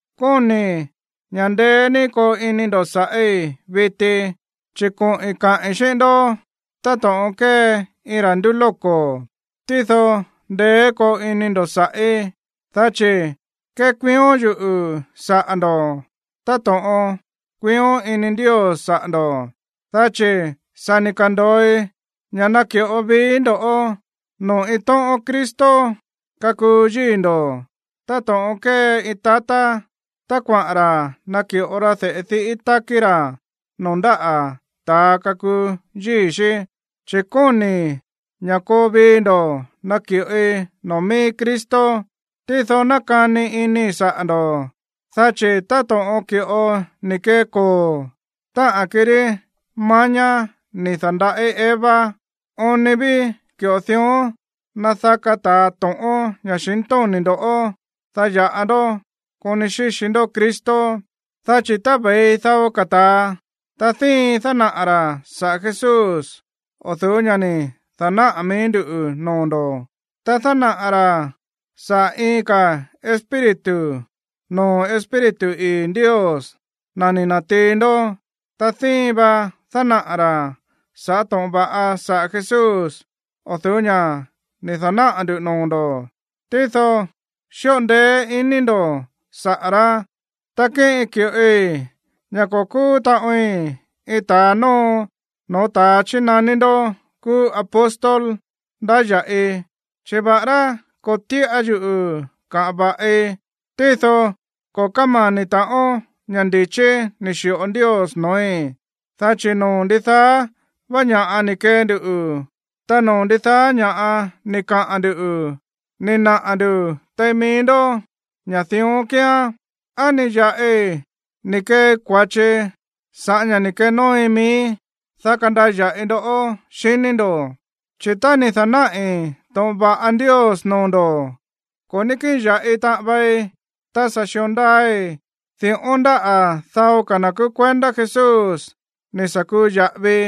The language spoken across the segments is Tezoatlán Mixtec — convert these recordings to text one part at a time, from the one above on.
Kóni̱i̱ ña̱ ndeé ní koo ini ndo̱ sa̱ꞌí viti, chi̱ koꞌi̱n kaꞌi̱n xíꞌín ndó táto̱ꞌon kée iin ra̱ ndúlóko̱. Tído ndeé koo ini ndo̱ sa̱ꞌí, dá chi̱ kékuión yuꞌu̱ saꞌa̱ ndo̱ táto̱ꞌon kuión ini Ndios saꞌa̱ ndo̱, dá chi̱ sa̱ ni̱ ka̱ndo̱oi ña̱ naki̱ꞌo viií ndo̱ꞌó noo̱ iin tóꞌón Cristo kakuu yíi̱ ndo̱ táto̱ꞌon kée iin tatá tá kuaꞌa̱n ra̱ naki̱ꞌo ra de̱ꞌe diꞌí tákí ra̱ noo̱ ndáꞌa̱ ta̱a kakuu yíi̱ xí. Chi̱ kóni̱i̱ ña̱ koo vii ndo̱ naki̱ꞌoi noo̱ mií Cristo. Tído nákani inii̱ saꞌa̱ ndo̱, dá chi̱ táto̱ꞌon ki̱ꞌo ni̱ kee koo̱, táꞌa̱n kirí mañá ni̱ da̱nda̱ꞌí Eva, oon ni ví ki̱ꞌo dión nadaká ta̱a to̱ꞌón ña̱xintóni̱ ndo̱, dá ya̱ꞌa ndó koni xíxi ndó Cristo. Dá chi̱ tá ve̱i dao ka̱ ta̱a, ta díin dánaꞌa̱ ra̱ saꞌa̱ Jesús o̱ du̱ú ña̱ ni̱ da̱náꞌa̱ mií nduꞌu̱ noo̱ ndo̱, ta dánaꞌa̱ ra̱ saꞌa̱ iin ka̱ espíritu noo̱ Espíritu ii̱ Ndios, na̱ ni̱ na̱tiin ndó, ta díin va dánaꞌa̱ ra̱ sa̱ꞌá to̱ꞌon va̱ꞌa saꞌa̱ Jesús o̱ du̱ú ña̱ ni̱ da̱náꞌa̱ ndu̱ noo̱ ndo̱, tído xíꞌo ndeé ini ndo̱ saꞌa̱ rá. Ta kíꞌin ki̱ꞌoi ña̱ ko̱ kúú taꞌoin iin ta̱a nóo no̱ó ta̱a chínaní ndó kúú apóstol ndáya̱ꞌi. Chi̱ va̱ꞌará ko̱ tíꞌa yuꞌu̱ kaꞌa̱n va̱ꞌi, tído ko̱ kámani̱ ta̱ꞌón ña̱ ndi̱chí ni̱ xi̱ꞌo Ndios no̱ói̱. Dá chi̱ noo̱ ndidaá vá ña̱ꞌa ni̱ kee ndu, ta noo̱ ndidaá ña̱ꞌa ni̱ kaꞌa̱n ndu̱, ni̱ naꞌa̱ ndu̱ tein mií ndó ña̱ dión kíán. ¿Á ni̱ ya̱ꞌi ni̱ keei kua̱chi sa̱ꞌá ña̱ ni̱ kenóoi miíí, dá kandaya̱ꞌi ndo̱ꞌó, xiní ndo̱? Chi̱ tá ni̱ da̱náꞌi̱ to̱ꞌon va̱ꞌa Ndios noo̱ ndo̱, ko̱ ní kíꞌin ya̱ꞌi taꞌan vei. Ta sa̱ xi̱o ndaai̱ di̱ꞌón ndáꞌa̱ dao ka̱ na̱ kúú kuendá Jesús ni̱ sa̱ kuu ya̱ꞌavii,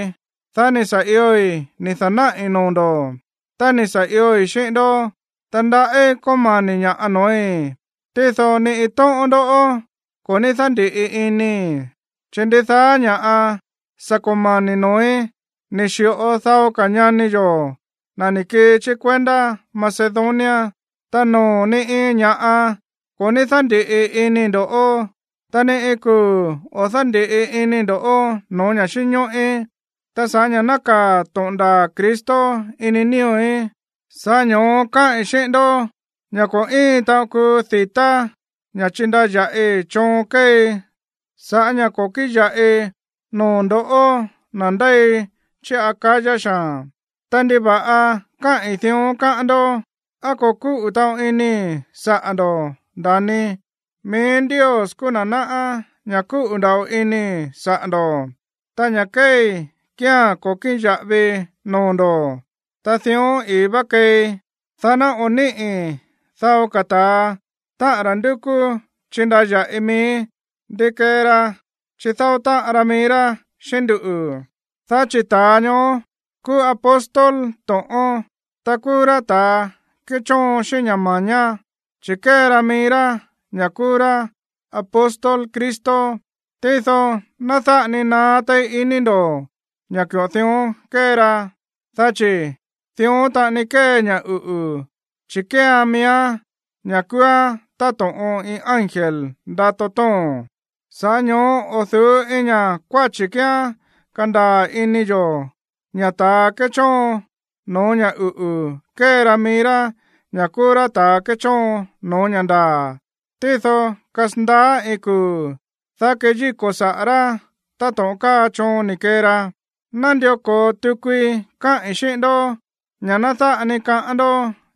dá ni̱ sa̱ ioi̱ ni̱ da̱náꞌi̱ noo̱ ndo̱. Tá ni̱ sa̱ ioi̱ xíꞌín ndó, ta ndaꞌí kómani̱ ña̱ꞌa noo̱í, tído ni iin tóꞌón ndó ko̱ ní dándi̱ꞌi inii̱. Chi̱ ndidaá ña̱ꞌa sa̱ komani̱ noo̱í ni̱ xi̱ꞌo dao ka̱ ñani yo̱, na̱ ni̱ kii chí kuendá Macedonia. Ta noo̱ ni iin ña̱ꞌa ko̱ ní dándi̱ꞌi inii̱ ndo̱ꞌó, ta ni iin kuu̱ o̱ dándi̱ꞌi inii̱ ndo̱ꞌó no̱ó ña̱ xínñóꞌí. Ta sa̱ꞌá ña̱ nákaa̱ to̱ꞌon ndaa̱ Cristo ini nío̱í, sa̱ꞌá ño̱ó káꞌi̱n xíꞌín ndó ña̱ ko̱ íin taꞌon kuu di̱tá ña̱ chíndaya̱ꞌii choon kéei sa̱ꞌá ña̱ ko̱ kíꞌin ya̱ꞌi noo̱ ndo̱ꞌó, na̱ ndéi chí Acaya xaa̱n. Ta, ¿ndiva̱ꞌa káꞌi̱n dión, káꞌán ndó? ¿Á ko̱ kúꞌu̱ taꞌon inii̱ saꞌa̱ ndo̱ꞌó, nda̱ni? Mií Ndios kúú na̱ náꞌá ña̱ kúꞌu̱ nda̱ꞌo inii̱ saꞌa̱ ndo̱. Ta ña̱ kéei kía̱n ko̱ kíꞌin ya̱ꞌavii noo̱ ndo̱, ta dión ii̱ vá keei, dá ná o̱ níꞌi̱ dao ka̱ ta̱a, táꞌa̱n ra̱ ndúkú chindaya̱ꞌii mií, ndi kee ra chidáó táꞌan ra mií rá xíꞌín nduꞌu̱. Dá chi̱ ta̱a ñoó kúú apóstol to̱ꞌón, ta kúú rá ta̱a kéchóon xíꞌín ña̱ ma̱ñá, chi̱ kée ra mií rá ña̱ kúú rá apóstol Cristo. Tído ná dáꞌa ni naá téí ini ndo̱ ña̱ ki̱ꞌo dión kée ra, dá chi̱ dión taꞌani kée ña̱ uꞌu̱, chi̱ kéean miíán ña̱ kúúán táto̱ꞌon iin ángel ndato tóo̱n. Sa̱ꞌá ño̱ó o̱ du̱ú iin ña̱ kuáchi̱ kíán kandaa̱ ini yo̱ ña̱ ta̱a kéchóon no̱ó ña̱ uꞌu̱ kée ra mií rá ña̱ kúú rá ta̱ kéchóon no̱ó ña̱ ndaa̱. Tído kasandaá iin kuu̱, dá keyíko̱ saꞌa̱ rá táto̱ꞌon káa choon ni̱ kee ra. Nándió ko̱o tukui káꞌi̱n xíꞌín ndó ña̱ ná dáꞌa ni kaꞌán ndó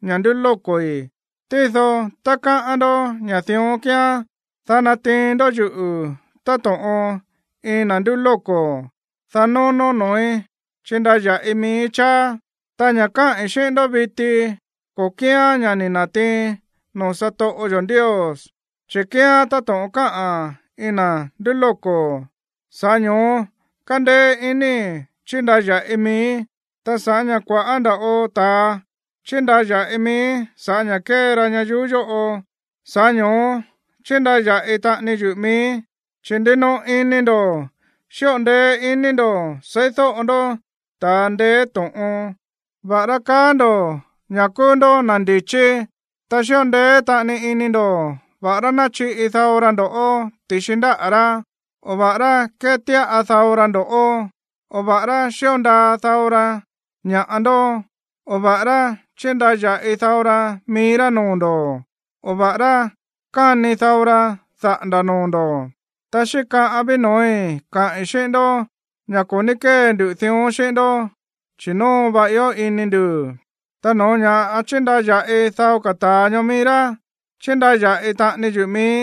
ña̱ ndúlóko̱i̱. Tído tá káꞌán ndó ña̱ dión kíán, dá natiin ndó yuꞌu̱ táto̱ꞌon iin na̱ ndúlóko̱, dá nónó noo̱í chindaya̱ꞌii miíí cháá. Ta ña̱ káꞌi̱n xíꞌín ndó viti, ko̱ kíán ña̱ ni̱ na̱tiiin noo̱ satoꞌo yo̱ Ndios. Chi̱ kíán táto̱ꞌon káꞌa̱n iin na̱ ndúlóko̱, sa̱ꞌá ño̱ó kándéé inii̱ chíndaya̱ꞌii miíí. Ta sa̱ꞌá ña̱ kua̱ꞌá nda̱ꞌo ta̱a chíndaya̱ꞌii mií sa̱ꞌá ña̱ kée ra ñayuú yóꞌo, sa̱ꞌá ño̱ó chindaya̱ꞌi taꞌani yuꞌu̱ miíí. Chi̱ ndinoꞌo ini ndo̱ xíꞌo ndeé iní ndo̱ seídóꞌo ndó ta̱a ndeé to̱ꞌon, va̱ꞌará kaá ndo̱ ña̱ kúú ndó na̱ ndi̱chí. Ta xíꞌo ndeé taꞌani ini ndo̱ va̱ꞌará náchiꞌi dao ra ndo̱ꞌó ti̱xi ndáꞌa̱ rá, o va̱ꞌará kétíꞌa dao ra ndo̱ꞌó, o va̱ꞌará xío ndaa dao ra ña̱ꞌa ndó, o va̱ꞌará chíndaya̱ꞌi dao ra mií rá noo̱ ndo̱, o va̱ꞌará káni dao ra daꞌa̱nda̱ noo̱ ndo̱. Ta xíkaꞌan ví no̱ói̱ kaꞌi̱n xíꞌín ndó ña̱ ko̱ ní kée ndu dión xíꞌín ndó, chi̱ nóo va ió ini ndu̱. Ta no̱ó ña̱ chíndaya̱ꞌi dao ka̱ ta̱a ñoó mií rá, chindaya̱ꞌi taꞌani yuꞌu̱ miíí,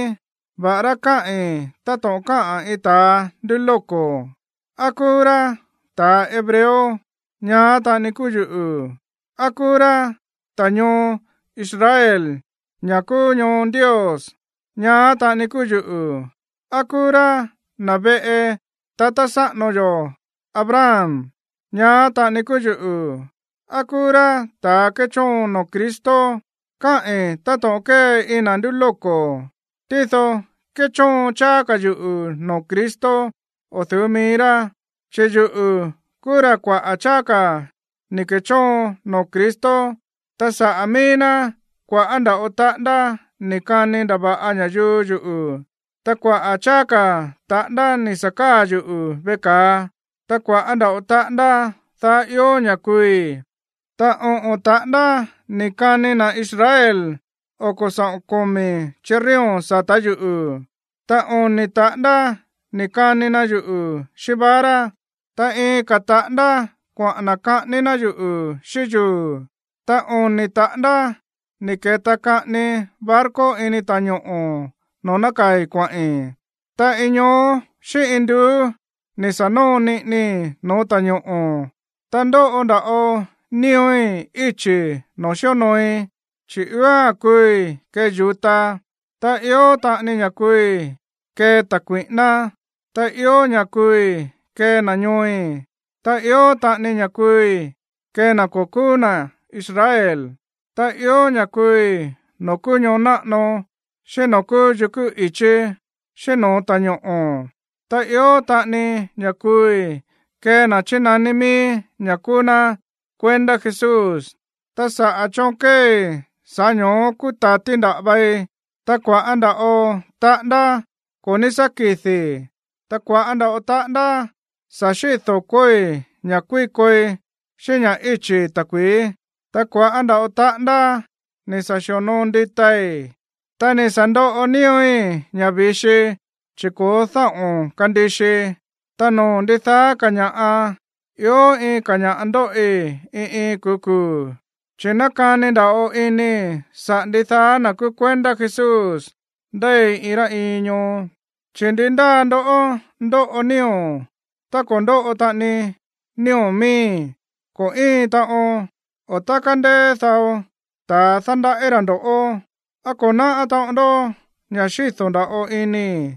va̱ꞌará káꞌi̱n táto̱ꞌon káꞌa̱n iin ta̱ ndúlóko̱. ¿Á kúú rá ta̱ hebreo? Ñaá taꞌani kúú yuꞌu̱. ¿Á kúú rá ta̱ ñoo Israel, ña̱ kúú ñoo Ndios? Ñaá taꞌani kúú yuꞌu̱. ¿Á kúú rá na̱ veꞌe tatá sáꞌano Abraham? Ñaá taꞌani kúú yuꞌu̱. ¿Á kúú rá ta̱ kéchóon noo̱ Cristo? (Káꞌi̱n táto̱ꞌon kée iin na̱ ndúlóko̱.) Tído kéchóon cháá ka̱ yuꞌu̱ noo̱ Cristo o̱ du̱ú mií rá, chi̱ yuꞌu̱ kúú ra̱ kuaꞌa̱ cháá ka̱ ni̱ ke̱chóon noo̱ Cristo. Ta saꞌa̱ mií ná kua̱ꞌá nda̱ꞌo taꞌándá ni̱ kani ndava̱ꞌa ña̱yuu yuꞌu̱, ta kuaꞌa̱ cháá ka̱ taꞌándá ni̱ sa̱ káa̱ yuꞌu̱ veꞌe ka̱a, ta kua̱ꞌá nda̱ꞌo taꞌándá daá ió ña̱ kuui̱. Ta oꞌo̱n taꞌándá ni̱ kani na̱ Israel oko̱ saꞌo̱n komi̱ chirrión sa̱tá yuꞌu̱. Ta oni̱ taꞌándá ni̱ kani na yuꞌu̱ xíꞌín vara, ta iin ka̱ taꞌándá kuaꞌa̱n na̱ kaꞌání ná yuꞌu̱ xíꞌín yuu̱, ta oni̱ taꞌándá ni̱ ke̱ta kaꞌani barco ini ta̱ñoꞌo̱ noo̱ nákaa̱i̱ kuaꞌi̱n, ta iin ñoó xíꞌín iin nduú ni̱ sa̱ nóo niꞌinii no̱ó ta̱ñoꞌo̱. Ta ndóꞌo nda̱ꞌo nío̱í íchi̱ noo̱ xíonooi, chi̱ ióa̱n kuui̱ kée yu̱ta, ta ió taꞌani ña̱ kuui̱ kée ta̱ kui̱ꞌíná, ta ió ña̱ kuui̱ kée na̱ ñooi̱, ta ió taꞌani ña̱ kuui̱ kée na̱ ko̱ kúú na̱ Israel. Ta ió ña̱ kuui̱ noo̱ kúú ñoo náꞌano, xíꞌín noo̱ kúú yukú i̱chí xíꞌín no̱ó ta̱ñoꞌo̱, ta ió taꞌani ña̱ kuui̱ kée na̱ chínaní mií ña̱ kúú ná kuendá Jesús. Ta sa̱ꞌá choon kéei, sa̱ꞌá ño̱ó kúta̱ti nda̱ꞌa vei, ta kua̱ꞌá nda̱ꞌo taꞌándá ko̱ ní sá kidi̱i̱, ta kua̱ꞌá nda̱ꞌo taꞌándá sa̱ xíꞌi do̱koi̱ ña̱ kuíkoi xíꞌín ña̱ íchi̱i̱ ta̱kui̱í, ta kua̱ꞌá nda̱ꞌo taꞌándá ni̱ sa̱ xi̱onoo nditai̱, ta ni̱ sa̱ ndoꞌo nío̱í ña̱ vi̱xi chi̱ ko̱ó dáꞌo̱n kandixii. Ta noo̱ ndidaá ka̱ ña̱ꞌa, ió iin ka̱ ña̱ꞌa ndóꞌi iin iin kuu̱ kuu̱, chi̱ nákani nda̱ꞌo inii̱ saꞌa̱ ndidaá na̱ kúú kuendá Jesús ndéi iin rá iin ñoo. Chi̱, ¿ndi ndáa ndoꞌó ndóꞌo nío̱, ta ko̱ ndóꞌo taꞌani nío̱ miíí? Ko̱ íin taꞌon. O, tá kándéé dao ta̱a dándaꞌí ra̱ ndo̱ꞌó, ¿á ko̱ náꞌá taꞌon ndó ña̱ xído̱ nda̱ꞌo inii̱?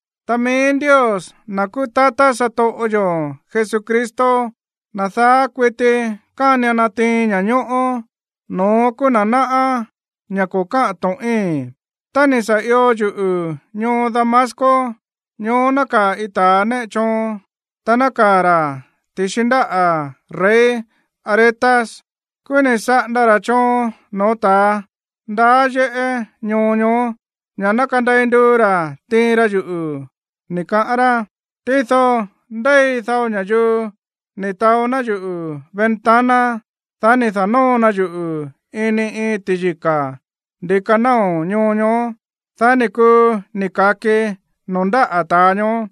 Ta mií Ndios, na̱ kúú tatá satoꞌo yo̱ Jesucristo, na̱ daá kuití kánian natiin ña̱ñóꞌó, no̱ón kúú na̱ náꞌá ña̱ ko̱ káꞌa̱n to̱ꞌíi̱n. Tá ni̱ sa̱ io yuꞌu̱ ñoo Damasco, ñoó nákaa̱ iin ta̱ néꞌe choon, ta nákaa̱ ra̱ ti̱xi ndáꞌa̱ rey Aretas. Kúú ni̱ saꞌanda ra̱ choon no̱ó ta̱ ndaá yéꞌé ñoo ñoó ña̱ ná kandei nduu ra̱ tiin ra yuꞌu̱, ni̱ kaꞌán rá. Tído ndéi dao ña̱yuu ni̱ taó ná yuꞌu̱ ventana, dá ni̱ da̱nóo na yuꞌu̱ ini iin ti̱yika̱ ndi̱ka náo̱ ñoo ñoó, dá ni̱ kuu ni̱ ka̱kii noo̱ ndáꞌa̱ ta̱a ñoó.